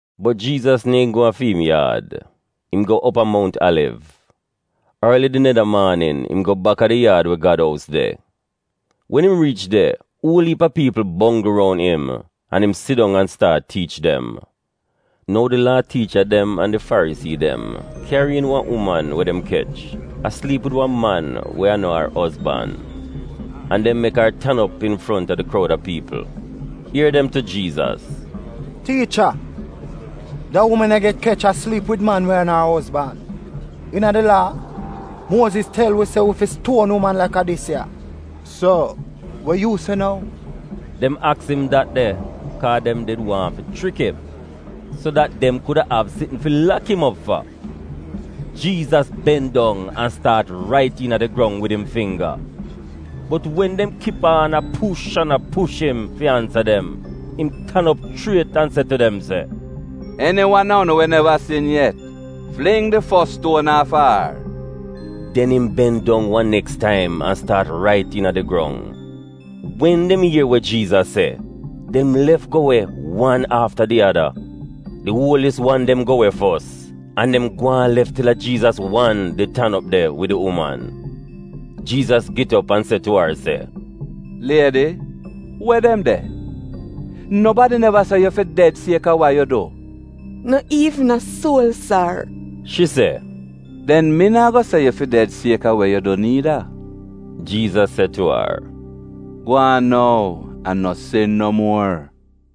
Bot Jiizas neehn go a fi im yaad. Im go op a Mount Aliv. Orli di neda maanin, im go baka di yaad we Gad ous de. Wen im riich de, uol iip a piipl bongl roun im, an im sidong an staat tiich dem. Nou di Laa tiicha dem an di Farisii dem kyari iin wan uman we dem kech a sliip wid wan man we a no ar ozban. An dem mek ar tan op infronta di kroud a piipl. Ier dem tu Jiizas, “Tiicha, da uman ya get kech a sliip wid man we a no ar ozban. Iina di Laa, Muoziz tel wi se wi fi stuon uman laka dis ya. So, we yu se nou?” (Dem aks im dat de kaa dem did wan fi chrik im, so dat dem kuda av sitn fi lak im op fa.) Jiizas ben dong an staat rait iina di grong wid im fingga. Bot wen dem kip aan a push an a push im fi ansa dem, im tan op chriet an se tu dem se, “Eni wan a unu we neva sin yet, fling di fos stuon aafa ar!” Den im ben dong wan neks taim an staat rait iina di grong. Wen dem ier we Jiizas se, dem lef go we wan afta di ada. Di uolis wan dem go we fos, an dem gwaan lef til a Jiizas wan did tan op de wid di uman. Jiizas get op an se tu ar se, “Liedi, we dem de? Nobadi neva se yu fi ded sieka wa yu du?” “No iivn a suol, sar,” shi se. “Den mi naa go se yu fi ded sieka we yu du niida,” Jiizas se tu ar. “Gwaan nou, an no sin no muor.”]]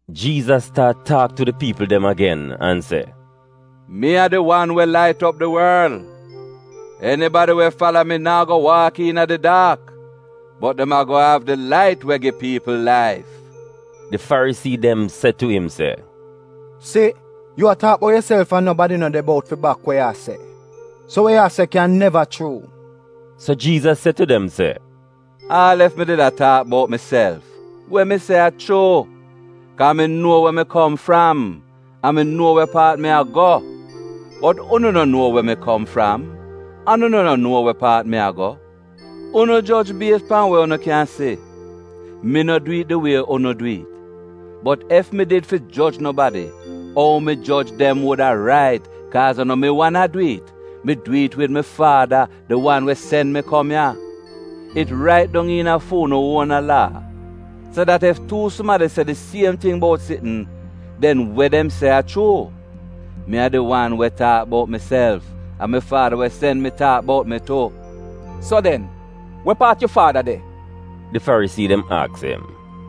Jiizas staat taak tu di piipl dem agen an se, “Mi a di wan we lait op di worl. Enibadi we fala mi naa go waak iina di daak, bot dem ago av di lait we gi piipl laif.” Di Farisii dem se tu im se, “Si, yu a taak bout yuself an nobadi no de bout fi bak wa yu a se. So we yu a se kyan neva chuu.” So Jiizas se tu dem se, “Aal ef mi did a taak bout miself, we mi a se chuu, kaa mi nuo we mi kom fram an mi nuo we paat mi a go. Bot unu no nuo we mi kom fram, an unu no nuo we paat mi a go. Unu joj bies pan we unu kyan si. Mi no dwi'it di wie unu dwi'it. Bot ef mi did fi joj nobadi, ou mi joj dem wuda rait, kaaz a no mi wan a dwi'it. Mi dwi'it wid mi Faada, di wan we sen mi kom ya. It rait dong iina fu'unu uona Laa se dat ef tuu sumadi se di siem ting bout sitn, den we dem se a chuu. Mi a di wan we taak bout miself, an mi faada we sen mi taak bout mi tu.” “So den, we paat yu Faada de?” di Farisii dem aks im.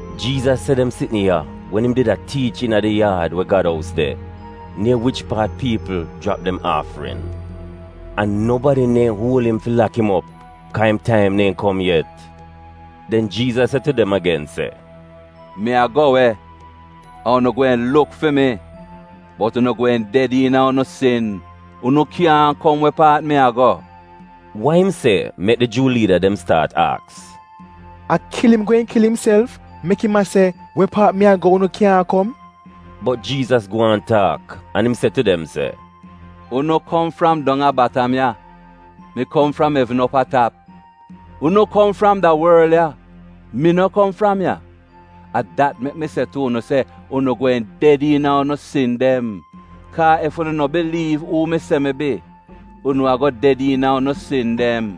(Jiizas se dem sitn ya wen im did a tiich iina di yaad we Gad ous de, nier wich paat piipl jrap dem aafrin. An nobadi neehn uol im fi lak im op, kaa im taim neehn kom yet.) Den Jiizas se tu dem agen se, “Mi a go we, an unu gweehn luk fi mi, bot unu gweehn ded iina unu sin. Unu kyaahn kom we paat mi a go.” Wa im se mek di Juu liida dem staat aks, “A kil im gweehn kil imself, mek im a se ‘We paat mi a go unu kyaahn kom’?” Bot Jiizas gwaan taak an im se tu dem se, “Unu kom fram dong a batam ya; mi kom fram evn op a tap. Unu kom fram da worl ya; mi no kom fram ya. A dat mek mi se tu unu se unu gweehn ded iina unu sin dem. Kaa ef unu no biliiv uu mi se mi bi, unu ago ded iina unu sin dem.”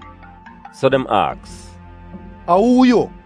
So dem aks, “A uu yu?”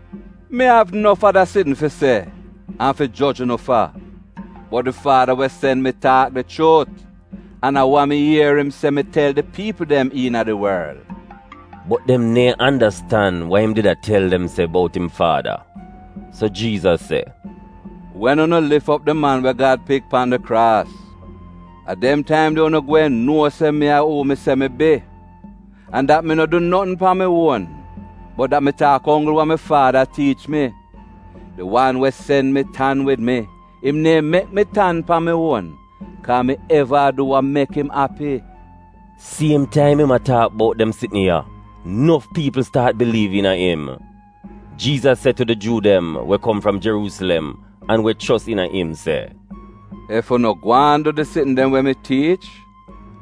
Mi av nof ada sitn fi se an fi joj unu fa, bot di Faada we sen mi taak di chuut, an a wa mi ier im se mi tel di piipl dem iina di worl.” (Bot dem neehn andastan wa im did a tel dem se bout im Faada.) So Jiizas se, “Wen unu lif op di Man we Gad Pik pan di kraas, a dem taim de unu gweehn nuo se mi a uu mi se mi bi, an dat mi no du notn pan mi uon bot dat mi taak onggl wa mi Faada tiich mi. Di wan we sen mi tan wid mi. Im neehn mek mi tan pan mi uon, kaa mi eva a du wa mek im api.” Siem taim im a taak bout dem sitn ya, nof piipl staat biliiv iina im. Jiizas se tu di Juu dem we kom fram Jeruusilem an we chos iina im se, “Ef unu gwaan du di sitn dem we mi tiich,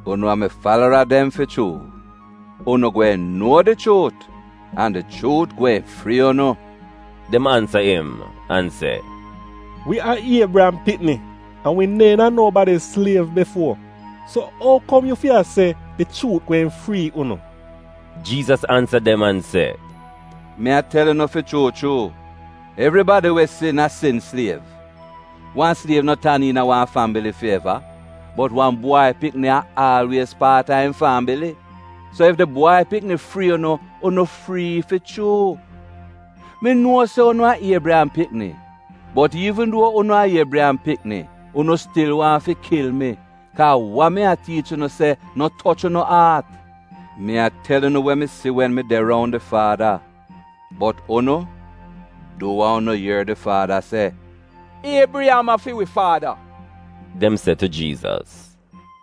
unu a mi falara dem fi chuu. Unu gweehn nuo di chuut, an di chuut gweehn frii unu.” Dem ansa im an se, “Wi a Iebriyam pikni an wi neehn a nobadi sliev bifuo. So, ou kom yu fi a se, ‘Di chuut gweehn frii unu’?” Jiizas ansa dem an se, “Mi a tel unu fi chuu chuu, evribadi we sin, a sin sliev. Wan sliev no tan iina wan fambili fi eva, bot wan bwai pikni a aalwiez paat a im fambili. So ef di Bwai Pikni frii unu, unu frii fi chuu. Mi nuo se unu a Iebriyam pikni. Bot iivn duo unu a Iebriyam pikni, unu stil waahn fi kil mi, kaa wa mi a tiich unu se no toch unu aat. Mi a tel unu we mi si wen mi de roun di Faada; bot unu, du wa unu ier di Faada se!” “Iebriyam a fi wi faada,” dem se tu Jiizas.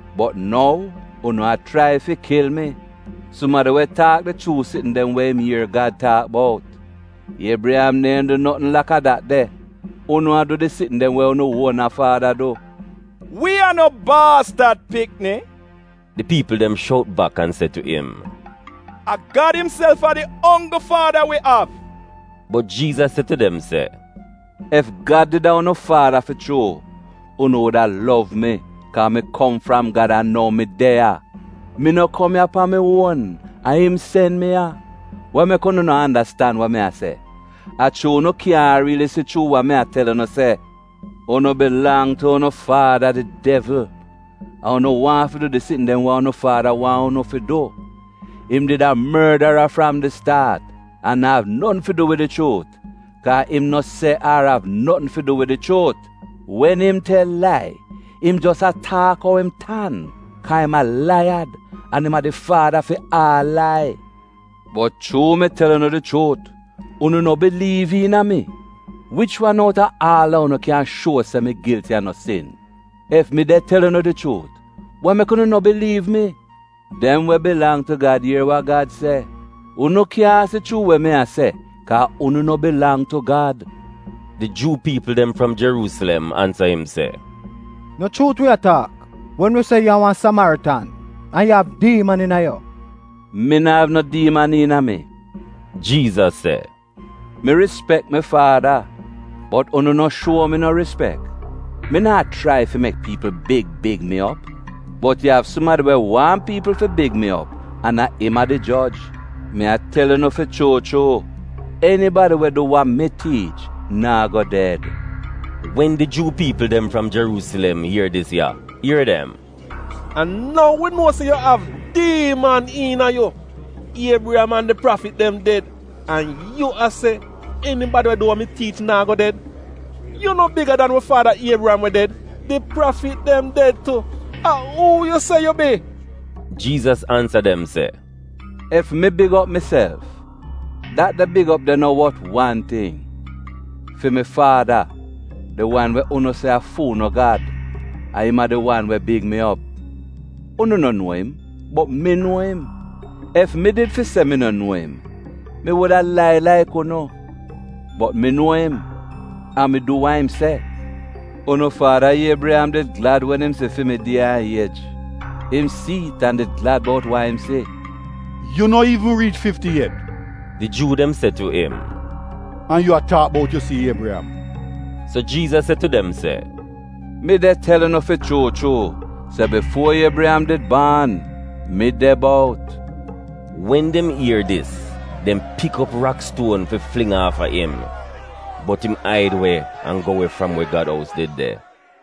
Bot nou, unu a chrai fi kil mi, sumadi we taak di chuu sitn dem we im ier Gad taak bout. Iebriyam neehn du notn laka dat de. Unu a du di sitn dem we unu uona faada du.” “Wi a no baastad pikni,” di piipl dem shout bak an se tu im. “A Gad imself a di onggl faada wi av.” Bot Jiizas se tu dem se, “Ef Gad did a unu Faada fi chuu, unu wuda lov mi, kaa mi kom fram Gad an nou mi de ya. Mi no kom ya pan mi uon; a im sen mi ya. Wa mek unu no andastan wa mi a se? A chuu unu kyaahn riili si chuu wa mi a tel unu se. Unu bilang tu unu faada, di devl, an unu waahn fi du di sitn dem we unu faada wan unu fi du. Im did a mordara fram di staat, an na'av notn fi du wid di chuut, kaa im no se ar av notn fi du wid di chuut. Wen im tel lai, im jos a taak ou im tan, kaa im a laiyad an im a di faada fi aal lai. Bot chuu mi tel unu di chuut, unu no biliiv iina mi. Wich wan outa aal a unu kyan shuo se mi gilti a no sin? Ef mi de tel unu di chuut, wa mek unu no biliiv mi? Dem we bilang tu Gad ier wa Gad se. Unu kyaahn si chuu we mi a se, kaa unu no bilang tu Gad.” Di Juu piipl dem fram Jeruusilem ansa im se, “No chuut wi a taak wen wi se yu a wan Samaritan an yu av diiman iina yu?” “Mi no av no diiman iina mi,” Jiizas se. “Mi rispek mi Faada, bot unu no shuo mi no rispek. Mi naa chrai fi mek piipl big big mi op. Bot yu av sumadi we waahn piipl fi big mi op, an im a di joj. Mi a tel unu fi chuu chuu, enibadi we du wa mi tiich naa go ded.” Wen di Juu piipl dem fram Jeruusilem ier dis ya, ier dem, “A nou wi nuo se yu av diiman iina yu! Iebriyam an di prafit dem ded, an yu a se, ‘Enibadi we du wa mi tiich naa go ded’! Yu no biga dan wi faada Iebriyam we ded? Di prafit dem ded tu. A uu yu se yu bi?” Jiizas ansa dem se, “Ef mi big op miself, dat de big op de no wot wan ting. Fi mi Faada, di wan we unu se a fu'unu Gad, a im a di wan we big mi op. Unu no nuo im, bot mi nuo im. Ef mi did fi se mi no nuo im, mi wuda lai laik unu. Bot mi nuo im, an mi du wa im se. Unu faada Iebriyam did glad wen im si fi mi die an iej. Im si'it an did glad bout wa im si.” “Yu no iivn riich fifti yet,” di Juu dem se tu im, “an yu a taak bout yu si Iebriyam!” So Jiizas se tu dem se, “Mi de tel unu fi chuu chuu se bifuo Iebriyam did baan, mi de bout!” Wen dem ier dis, dem pik op rakstuon fi fling aafa im, bot im aid we an go we fram we Gad ous did de.